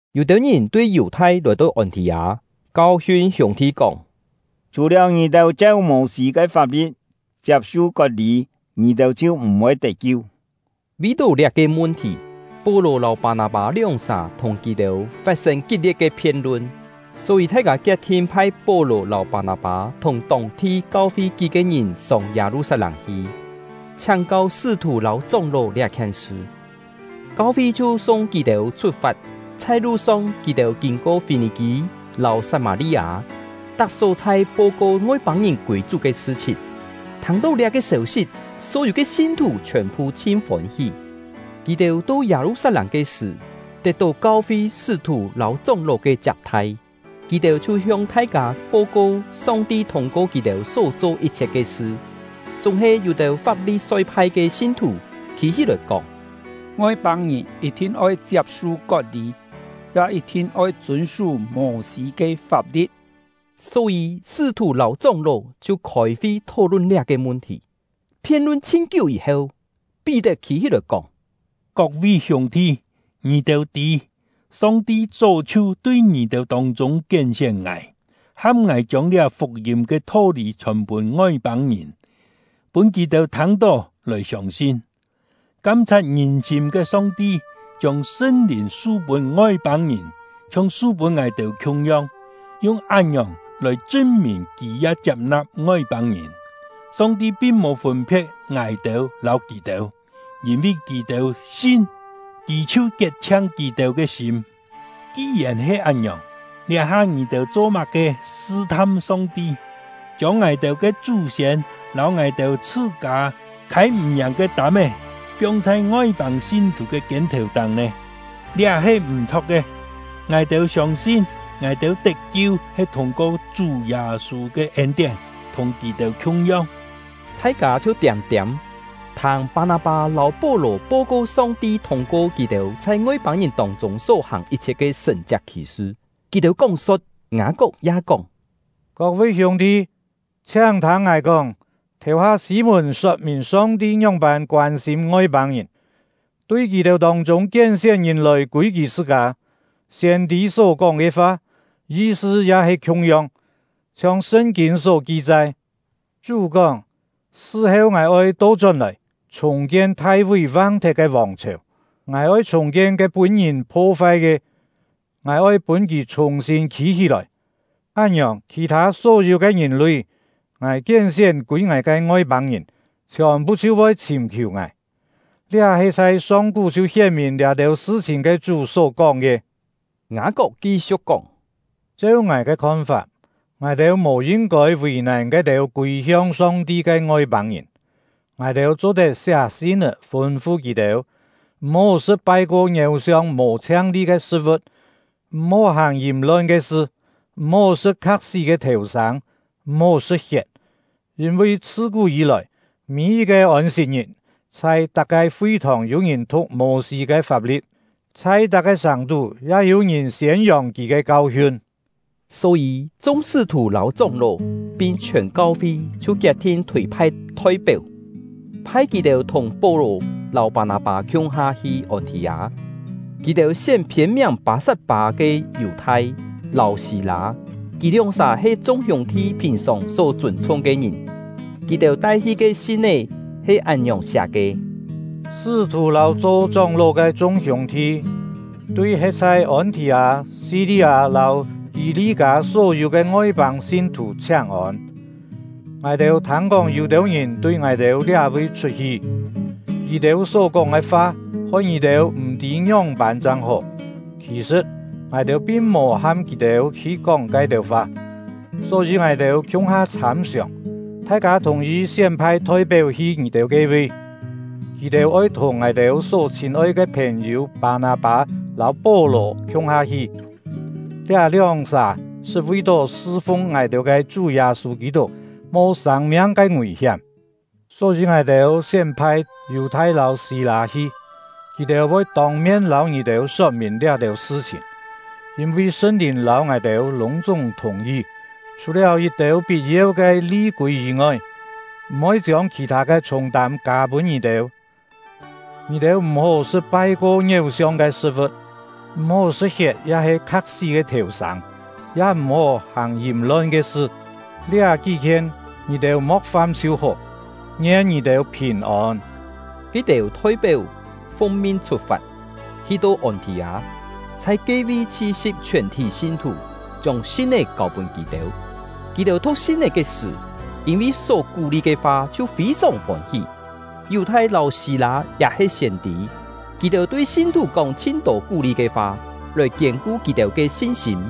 Yû-têu ngìn tui Yù-thai lòi-to Ôn-thì-â, kau-hiun hiûng-thi kóng: “Chhù-liáu ngì-têu cheu Mô-sî ke fap-li̍t chiap-su kot-lî, ngì-têu chhiu m̀-voi tet-kiu.” Vi-tó liá-ke mun-thì, Pó-lò lâu Pâ-nâ-pâ lióng-sà thùng kì-têu fat-sên kit-lie̍t ke phien-lun. Só-yî, thai-kâ kiet-thin phai Pó-lò lâu Pâ-nâ-pâ, thùng tông-thi kau-fi kí-ke ngìn sông Yâ-lu-sat-lâng hi, chhiáng-kau sṳ́-thù lâu chóng-ló liá-khien sṳ. Kau-fi chhiu sung kì-têu chhut-fat. Chhai lu-song, kì-têu kîn-ko Fî-nì-kî lâu Sat-mâ-li-â, tak só-chhai po-ko Ngoi-pâng-ngìn kûi Chú ke sṳ-chhìn. Thâng-tó liá-ke sêu-sit, só-yû ke sin-thù chhiòn-phu chhin fôn-hí. Kì-têu to Yâ-lu-sat-lâng ke sṳ̀, tet-tó kau-fi, sṳ́-thù lâu chóng-ló ke chiap-thai. Kì-têu chhiu hiong thai-kâ po-ko Song-ti thûng-ko kì-têu só-cho yit-chhiet ke sṳ. Chúng-he yû-têu Fap-li-soi-phai ke sin-thù khî-hí-lòi kóng: “Ngoi-pâng-ngìn yit-thin oi chiap-su kot-lî, ya yit-thin oi chûn-sú Mô-sî ke fap-li̍t.” Só-yî, sṳ́-thù lâu chóng-ló chhiu khôi-fi thó-lun liá-ke mun-thì. Phien-lun chhin-kiú yî-heu, Pí-tet khî-hí-lòi kóng: “Kok-vi hiûng-thi, ngì-têu tî, Song-ti chó chhiu tui ngì-têu tông-chûng kién-sién ngài, ham ngài chiông liá fuk-yîm ke tho-lî chhòn pûn Ngoi-pâng-ngìn, pûn kì-têu thâng-tó lòi siông-sin. Kam-chhat ngìn-sîm ke Song-ti chiông Sṳn-Lìn su-pûn Ngoi-pâng-ngìn, chhiong su-pûn ngài-têu khiung-yong, yung án-ngiòng lòi chṳn-mìn Kì ya chiap-na̍p Ngoi-pâng-ngìn. Song-ti pin mò fûn-phe̍t ngài-têu lâu kì-têu; yîn-vi kì-têu sin, Kì chhiu kiet-chhiang kì-têu ke sîm. Ki-yèn he án-ngiòng, liá-ha ngì-têu cho-má-ke sṳ-tham Song-ti, chiông ngài-têu ke chú-siên lâu ngài-têu chhṳ-kâ khâi-m̀-yàng ke tâm-é, piong chhai Ngoi-pâng sin-thù ke kiên-thèu-táng nè? Liá he m̀-chho̍k ke! Ngài-têu siông-sin, ngài-têu tet-kiu he thûng-ko Chú Yâ-sû ke ên-tién, thùng kì-têu khiung-yong.” Thai-kâ chhiu tiâm-tiâm, thâng Pâ-nâ-pâ lâu Pó-lò po-ko Song-ti thûng-ko kì-têu chhai Ngoi-pâng-ngìn tông-chûng só hàng yit-chhiet ke sṳ̀n-chiak khì-sṳ. Kì-têu kóng-so̍t, Ngâ-kok ya kóng: “Kok-vi hiûng-thi, chhiáng-thâng ngài kóng! Thèu-ha Sî-mùn sot-mìn Song-ti ngióng-pân koân-sîm Ngoi-pâng-ngìn, tui kì-têu tông-chûng kién-sién ngìn lòi kûi Kì chhṳ-kâ. Siên-tî só-kóng ke fa, yi-sṳ ya he khiung-yong. Chhiong Sṳn-kîn só ki-chai: Chú kóng: Sṳ-heu Ngài oi to-chón-lòi, chhùng-kien Thai-ví vang-thet ke vòng-chhèu; Ngài oi chhùng-kien ke pûn-ngìn pho-fai ke, Ngài oi pûn kì chhùng-sîn khî-hí-lòi. Án-ngiòng, khì-thâ só-yû ke ngìn-lui, Ngài kién-sién kûi Ngài ke Ngoi-pâng-ngìn, chhiòn-phu chhiu voi chhìm-khiù Ngài. Liá he chhai song-kú chhiu hién-mìn liá-têu sṳ-chhìn ke Chú só-kóng ke.” Ngâ-kok ki-siu̍k kóng: “Cheu ngài ke khon-fap, ngài-têu mò yin-kôi vì-nàn ke-têu kûi-hiong Song-ti ke Ngoi-pâng-ngìn. Ngài-têu cho-tet siá sin-é, fûn-fu kì-têu: M̀-hó sṳ̍t pai-ko ngiéu-siong mò chhiang-li ke sṳ̍t-vu̍t, m̀-hó hàng yìm-lon ke sṳ, m̀-hó sṳ̍t kha̍k-sí ke thèu-sâng, m̀-hó sṳ̍t hiet. Yîn-vi chhṳ-kú yî-lòi, mî-yit-ke Ôn-sit-ngit, chhai tak-ke fi-thòng yû ngìn thu̍k Mô-sî ke fap-li̍t, chhai tak-ke sàng-tú ya yû-ngìn siên-yòng kì ke kau-hiun.” Só-yî, chung sṳ́-thù lâu chóng-ló, pin chhiòn kau-fi chhiu kiet-thin chhûi-phai thoi-péu, phai kì-têu thùng Pó-lò lâu Pâ-nâ-pâ khiung-ha hi Ôn-thì-â. Kì-têu sién phiên-miàng Pâ-sat-pâ ke Yù-thai lâu Sî-lâ. Kì lióng-sà he chung hiûng-thi phìn-sòng só chûn-chhung ke ngìn. Kì-têu tai-hi ke sin-é he án-ngiòng siá ke: “Sṳ́-thù lâu cho chóng-ló ke chung hiûng-thi, tui he̍t chhai Ôn-thì-â, Si-li-â lâu Kî-li-kâ só-yû ke Ngoi-pâng sin-thù chhiáng-ôn! Ngài-têu thâng-kóng yû-têu ngìn tui ngài-têu liá-vi chhut-hi; kì-têu só-kóng ke fa hoi ngì-têu m̀-tî ngióng-pân chang hó. Khì-sṳ̍t, ngài-têu pin mò ham kì-têu hi kóng ke-têu fa. Só-yî ngài-têu khiung-ha chhâm-siòng, thai-kâ thùng-yi sién-phai thoi-péu hi ngì-têu ke-vi. Kì-têu oi thùng ngài-têu só chhîn-oi ke phèn-yû Pâ-nâ-pâ lâu Pó-lò khiung-ha hi; liá lióng-sà sṳt vi-tó sṳ-fung ngài-têu ke Chú Yâ-sû Kî-tuk mo sâng-miang ke ngùi-hiám. Só-yî ngài-têu sién-phai Yù-thai lâu Sî-lâ hi; kì-têu voi tông-mien lâu ngì-têu sot-mìn liá-têu sṳ-chhìn. Yîn-vi Sṳn-Lìn lâu ngài-têu lûng-chúng thùng-yi, chhù-liáu yit-têu pit-yeu ke li-kûi yî-ngoi, m̀-oi chiông khì-thâ ke chhûng-tâm kâ pûn ngì-têu. Ngì-têu m̀-hó sṳ̍t pai-ko ngiéu-siong ke sṳ̍t-vu̍t; m̀-hó sṳ̍t hiet ya-he kha̍k-sí ke thèu-sâng; ya m̀-hó hàng yìm-lon ke sṳ. Liá kí-khien, ngì-têu mo̍k fam chhiu hó. Ngien ngì-têu phìn-ôn!” Ke-têu thoi-péu fung-min chhut-fat, hi-to Ôn-thì-â, chhai ke-vi chhi-si̍p chhiòn-thí sin-thù, chiông sin-é kâu-pûn kì-têu. Kì-têu thu̍k sin-é ke sṳ̀, yîn-vi só kú-li ke fa chhiu fî-sòng fôn-hí. Yù-thai lâu Sî-lâ ya he siên-tî; kì-têu tui sin-thù kóng chhin-tô kú-li ke fa, lòi kiên-ku kì-têu ke sin-sîm.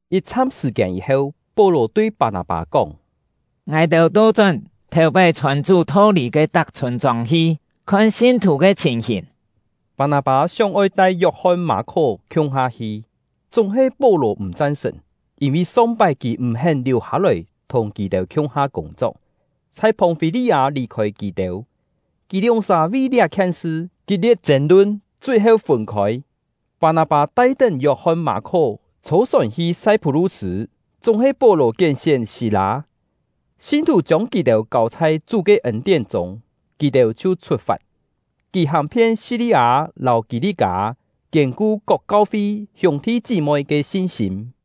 Yit-chham sṳ̀-kiên yî-heu, Pó-lò tui Pâ-nâ-pâ kóng: “Ngài-têu to-chón thèu-pái chhòn Chú tho-lî ke tak chhûn-chông hi, khon sin-thù ke chhìn-hìn.” Pâ-nâ-pâ sióng-oi tai Yok-hon-Mâ-khó khiung-ha hi, chúng-he Pó-lò m̀ chan-sṳ̀n; yîn-vi song-pái kì m̀-hén liù hâ-lòi thùng kì-têu khiung-ha kûng-chok, chhai Phòng-fî-li-â lì-khôi kì-têu. Kì lióng-sà vi liá-khien sṳ kit-lie̍t chên-lun, chui-heu fûn-khôi. Pâ-nâ-pâ tai-tén Yok-hon-Mâ-khó chhô-sòn hi Sai-phú-lu-sṳ̂, chúng-he Pó-lò kién-sién Sî-lâ; sin-thù chiông kì-têu kâu chhai Chú ke ên-tién chûng, kì-têu chhiu chhut-fat. Kì hàng-phien Si-li-â lâu Kî-li-kâ, kiên-ku kok kau-fi hiûng-thi chí-moi ke sin-sîm.